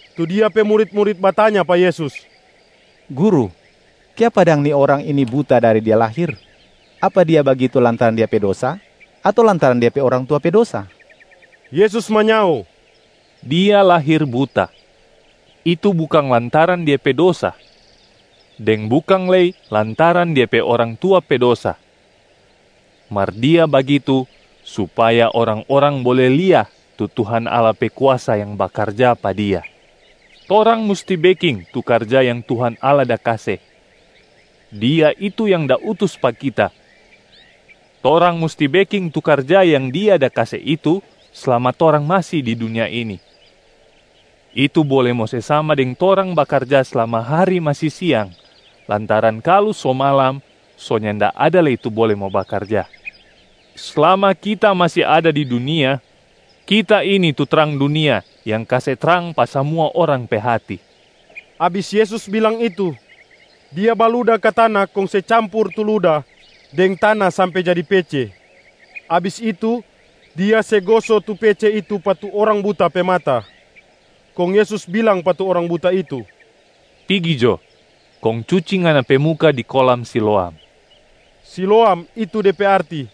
Tu Dia pe murit-murit batanya pa Yesus, “Guru, kiapa dang ni orang ini buta dari dia lahir? Apa dia bagitu lantaran dia pe dosa ato lantaran dia pe orang tua pe dosa?” Yesus manyao, “Dia lahir buta, itu bukang lantaran dia pe dosa deng bukang lei lantaran dia pe orang tua pe dosa, mar dia bagitu supaya orang-orang bole lia tu Tuhan Allah pe kuasa yang bakarja pa dia. Torang musti beking tu karja yang Tuhan Allah da kase. Dia itu yang da utus pa Kita. Torang musti beking tu karja yang Dia da kase itu slama torang masi di dunia ini. Itu bole mo se sama deng torang bakarja slama hari masi siang lantaran kalu so malam so nyanda ada lei tu bole mo bakarja. Slama Kita masi ada di dunia, Kita ini tu trang dunia yang kase trang pa samua orang pe hati.” Abis Yesus bilang itu, Dia baluda ka tana kong se campur tu luda deng tana sampe jadi pece. Abis itu, Dia se goso tu pece itu pa tu orang buta pe mata. Kong Yesus bilang pa tu orang buta itu, “Pigi jo, kong cuci ngana pe muka di kolam Siloam.” (Siloam itu de pe arti,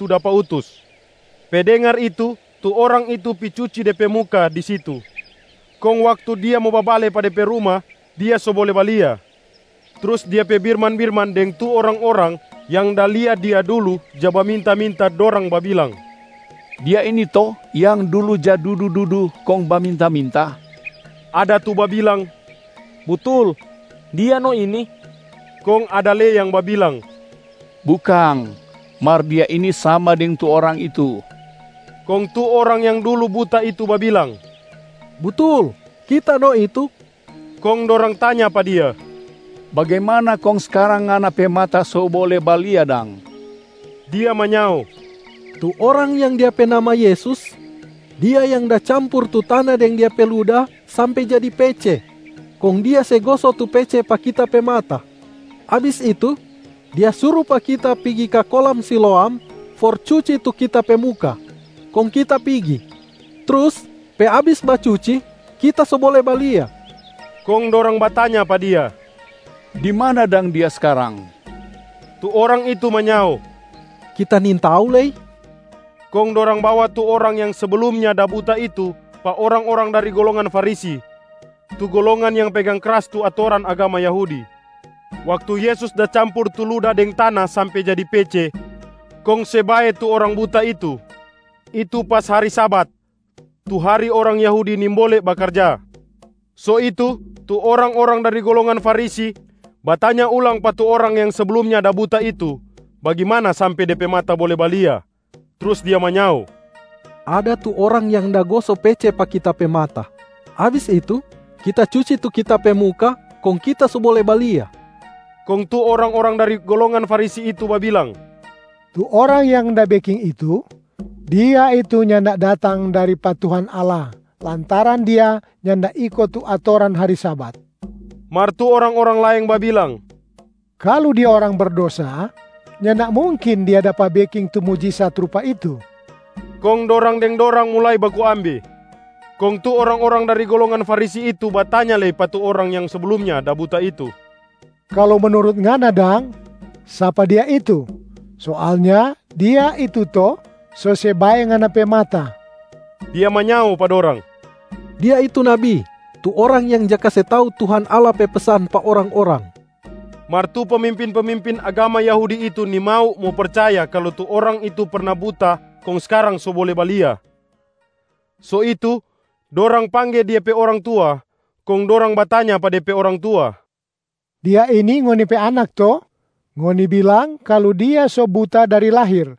‘Tu dapa utus’.) Pe dengar itu, tu orang itu pi cuci de pe muka di situ. Kong waktu dia mo babale pa de pe ruma, dia so bole balia. Trus dia pe birman-birman deng tu orang-orang yang da lia dia dulu ja baminta-minta, dorang babilang, “Dia ini to yang dulu ja dudu-dudu kong baminta-minta?” Ada tu babilang, “Butul, dia no ini.” Kong ada lei yang babilang, “Bukang, mar dia ini sama deng tu orang itu.” Kong tu orang yang dulu buta itu babilang, “Butul, kita no itu.” Kong dorang tanya pa dia, “Bagimana kong skarang ngana pe mata so bole balia dang?” Dia manyao, “Tu Orang yang Dia pe nama Yesus, Dia yang da campur tu tana deng Dia pe luda sampe jadi pece, kong Dia se goso tu pece pa kita pe mata. Abis itu, Dia suru pa kita pigi ka kolam Siloam for cuci tu kita pe muka. Kong kita pigi, trus pe abis bacuci, kita so bole balia.” Kong dorang batanya pa dia, “Di mana dang Dia skarang?” Tu orang itu manyao, “Kita nintau lei.” Kong dorang bawa tu orang yang seblumnya da buta itu pa orang-orang dari golongan Farisi, tu golongan yang pegang kras tu atoran agama Yahudi. Waktu Yesus da campur tu luda deng tana sampe jadi pece kong se bae tu orang buta itu, itu pas hari Sabat, tu hari orang Yahudi nimbole bakarja. So itu, tu orang-orang dari golongan Farisi batanya ulang pa tu orang yang seblumnya da buta itu bagimana sampe dia pe mata bole balia. Trus dia manyao, “Ada tu Orang yang da goso pece pa kita pe mata. Abis itu, kita cuci tu kita pe muka, kong kita so bole balia.” Kong tu orang-orang dari golongan Farisi itu babilang, “Tu Orang yang da beking itu, Dia itu nyanda datang dari pa Tuhan Allah lantaran Dia nyanda iko tu atoran hari Sabat.” Mar tu orang-orang laeng babilang, “Kalu Dia orang berdosa, nyanda mungkin dia dapa beking tu mujisat rupa itu.” Kong dorang deng dorang mulai baku ambe. Kong tu orang-orang dari golongan Farisi itu batanya lei pa tu orang yang seblumnya da buta itu, “Kalu menurut ngana dang, sapa Dia itu? Soalnya Dia itu to so se bae ngana pe mata.” Dia manyao pa dorang, “Dia itu nabi, tu orang yang ja kase tau Tuhan Allah pe pesan pa orang-orang.” Mar tu pemimpin-pemimpin agama Yahudi itu nimau mo percaya kalu tu orang itu perna buta kong skarang so bole balia. So itu, dorang pangge dia pe orang tua. Kong dorang batanya pa de pe orang tua, “Dia ini ngoni pe anak to? Ngoni bilang kalu dia so buta dari lahir,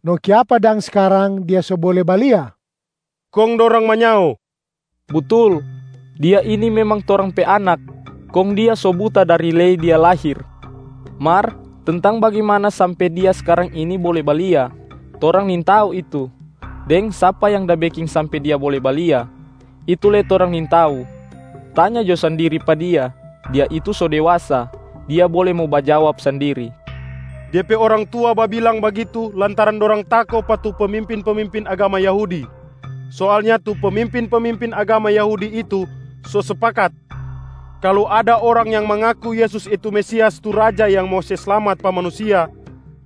no kiapa dang skarang dia so bole balia?” Kong dorang manyao, “Butul, Dia ini memang torang pe anak, kong dia so buta dari lei dia lahir. Mar tentang bagimana sampe dia skarang ini bole balia, torang nintau itu, deng sapa yang da beking sampe dia bole balia, itu lei torang nintau. Tanya jo sandiri pa dia, dia itu so dewasa, dia bole mo bajawab sandiri.” Dia pe orang tua babilang bagitu lantaran dorang tako pa tu pemimpin-pemimpin agama Yahudi. Soalnya tu pemimpin-pemimpin agama Yahudi itu so spakat kalu ada orang yang mangaku Yesus itu Mesias tu Raja yang mo se slamat pa manusia,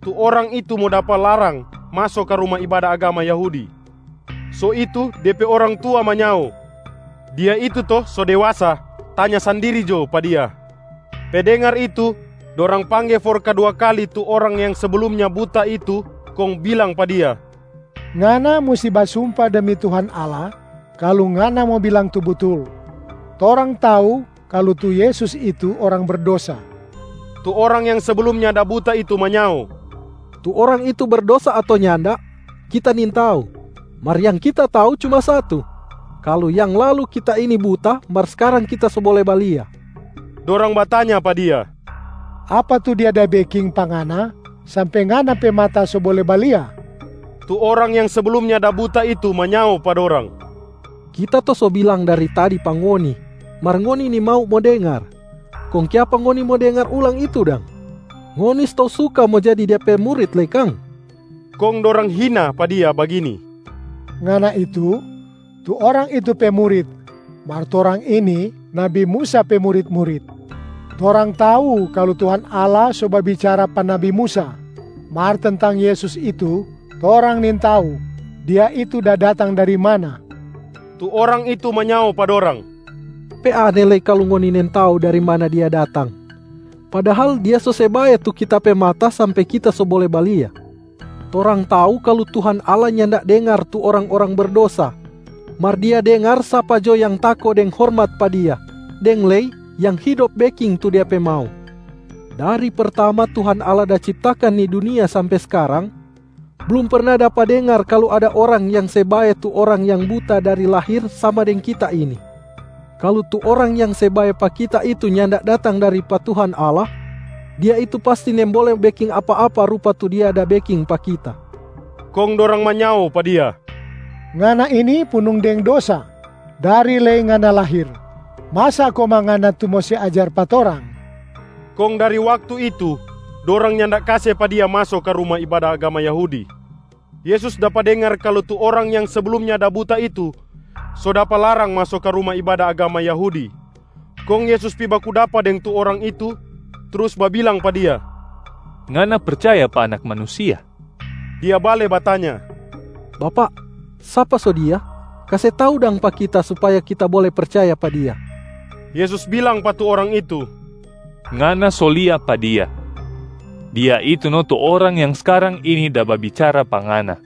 tu orang itu mo dapa larang maso ka ruma ibada agama Yahudi. So itu, dia pe orang tua manyao, “Dia itu to so dewasa, tanya sandiri jo pa dia.” Pe dengar itu, dorang pangge for kadua kali tu orang yang seblumnya buta itu kong bilang pa dia, “Ngana musti basumpa demi Tuhan Allah kalu ngana mo bilang tu butul. Torang tau kalu tu Yesus itu Orang berdosa.” Tu orang yang seblumnya da buta itu manyao, “Tu Orang itu berdosa ato nyanda, kita nintau. Mar yang kita tau cuma satu, kalu yang lalu kita ini buta mar skarang kita so bole balia.” Dorang batanya pa dia, “Apa tu Dia da beking pa ngana sampe ngana pe mata so bole balia?” Tu orang yang seblumnya da buta itu manyao pa dorang, “Kita to so bilang dari tadi pa ngoni, mar ngoni nimau mo dengar. Kong kiapa ngoni mo dengar ulang itu dang? Ngoni stou suka mo jadi Dia pe murit lei kang?” Kong dorang hina pa dia bagini, “Ngana itu, tu Orang itu pe murit, mar torang ini nabi Musa pe murit-murit. Torang tau kalu Tuhan Allah so babicara pa nabi Musa, mar tentang Yesus itu torang nintau Dia itu da datang dari mana.” Tu orang itu manyao pa dorang, “Pe aneh lei kalu ngoni nintau dari mana Dia datang, padahal Dia so se bae tu kita pe mata sampe kita so bole balia. Torang tau kalu Tuhan Allah nyanda dengar tu orang-orang berdosa, mar Dia dengar sapa jo yang tako deng hormat pa Dia, deng lei yang hidop beking tu Dia pe mau. Dari pertama Tuhan Allah da ciptakan ni dunia sampe skarang, blum perna dapa dengar kalu ada orang yang se bae tu orang yang buta dari lahir sama deng kita ini. Kalu tu Orang yang se bae pa kita itu nyanda datang dari pa Tuhan Allah, Dia itu pasti nimbole beking apa-apa rupa tu Dia da beking pa kita.” Kong dorang manyao pa dia, “Ngana ini punung deng dosa dari lei ngana lahir. Masa komang ngana tu mo se ajar pa torang!” Kong dari waktu itu, dorang nyanda kase pa dia maso ka ruma ibada agama Yahudi. Yesus dapa dengar kalu tu orang yang seblumnya da buta itu so dapa larang maso ka ruma ibada agama Yahudi. Kong Yesus pi baku dapa deng tu orang itu trus babilang pa dia, “Ngana percaya pa Anak Manusia?” Dia bale batanya, “Bapak, sapa so Dia? Kase tau dang pa kita supaya kita bole percaya pa Dia.” Yesus bilang pa tu orang itu, “Ngana so lia pa Dia, Dia itu no tu Orang yang skarang ini da babicara pa ngana.”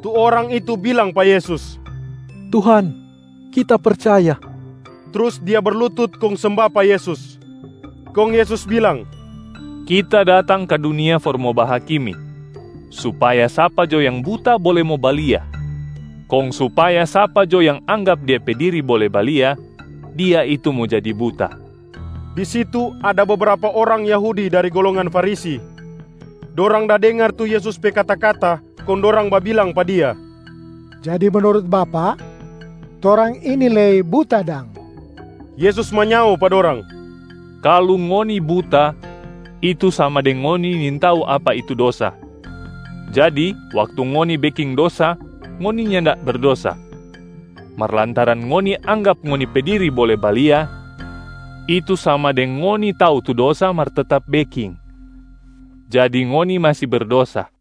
Tu orang itu bilang pa Yesus, “Tuhan, kita percaya.” Trus dia berlutut kong semba pa Yesus. Kong Yesus bilang, “Kita datang ka dunia for mo bahakimi, supaya sapa jo yang buta bole mo balia, kong supaya sapa jo yang anggap dia pe diri bole balia, dia itu mo jadi buta.” Di situ, ada bebrapa orang Yahudi dari golongan Farisi. Dorang da dengar tu Yesus pe kata-kata kong dorang babilang pa Dia, “Jadi menurut Bapak, torang ini lei buta dang?” Yesus manyao pa dorang, “Kalu ngoni buta, itu sama deng ngoni nintau apa itu dosa, jadi waktu ngoni beking dosa ngoni nyanda berdosa. Mar lantaran ngoni anggap ngoni pe diri bole balia, itu sama deng ngoni tau tu dosa mar tetap beking, jadi ngoni masi berdosa.”